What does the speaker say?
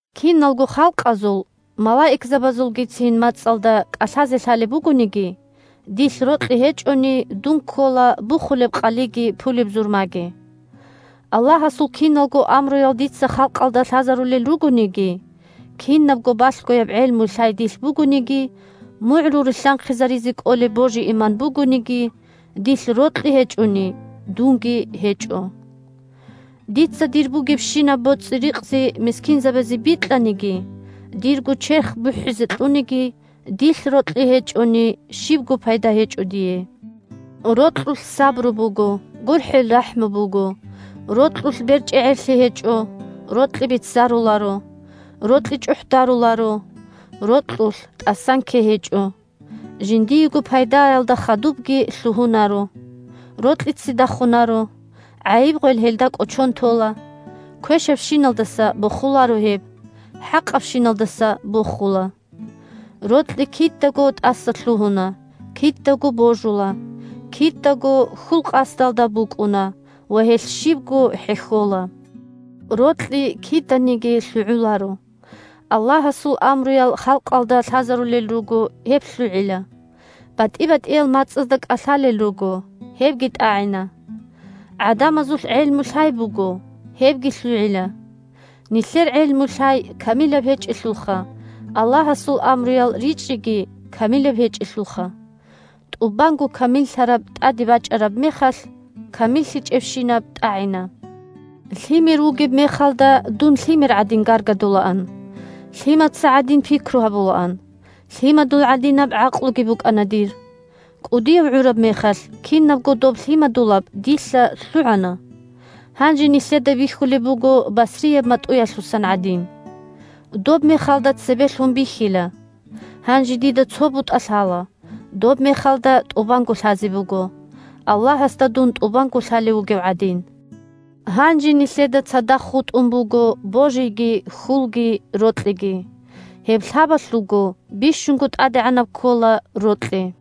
Киналго халкъазул, малаикзабазулгицин мацӀалда кӀалъазе лъалеб бугониги, дилъ рокьи гьечӀони – дун ккола бухулеб къалиги пулеб зурмаги. Аллагьасул киналго амруял дица халкъалда лъазарулел ругониги, кинабго балъгояб гӀелму-лъай дилъ бугониги, мугӀрул рилълъанхъизаризе кӀолеб божи-иман бугониги, – дилъ рокьи гьечӀони, дунги гьечӀо. Дица дир бугебщинаб боцӀи-рикъзи мискинзабазе бикьаниги, дирго черх бухӀизе кьуниги – дилъ рокьи гьечӀони, щибго пайда гьечӀо дие. Рокьулъ сабру буго, гурхӀел-рахӀму буго, рокьулъ берчӀегӀерлъи гьечӀо, рокьи беццаруларо, рокьи чӀухӀдаруларо, рокьулъ тӀасанккей гьечӀо, жиндиего пайдаялда хадубги лъугьунаро, рокьи ццидахунаро, гӀайиб-гъвел гьелда кӀочон тола, квешабщиналдаса бохуларо гьеб, хӀакъабщиналдаса бохула. Рокьи кидаго тӀасалъугьуна, кидаго божула, кидаго хьул-къасдалда букӀуна ва гьелъ щибго хӀехьола. Рокьи киданиги лъугӀуларо. Аллагьасул амруял халкъалда лъазарулел руго – гьеб лъугӀила. БатӀи-батӀиял мацӀазда кӀалъалел руго – гьебги тӀагӀина. ГӀадамазулъ гӀелму-лъай буго – гьебги лъугӀила. Нилъер гӀелму-лъай камилаб гьечӀелъулха, Аллагьасул амруял ричӀчӀиги камилаб гьечӀелъулха. ТӀубанго камиллъараб тӀаде бачӀараб мехалъ, камиллъичӀебщинаб тӀагӀина. Лъимер вугеб мехалда дун лъимер гӀадин гаргадулаан, лъимаца гӀадин пикру гьабулаан, лъимадул гӀадинаб гӀакълуги букӀана дир. КӀудияв гӀураб мехалъ, кинабго доб лъимадулаб дилъа лъугӀана. Гьанже нилъеда бихьулеб буго басрияб матӀуялъусан гӀадин. Доб мехалда цебе лъун бихьила. Гьанже дида цо бутӀа лъала, доб мехалда тӀубанго лъазе буго, Аллагьасда дун тӀубанго лъалев вугев гӀадин. Гьанже нилъеда цадахъ хутӀун буго божиги, хьулги, рокьиги. Гьеб лъабалъулго бищунго тӀадегӀанаб ккола рокьи.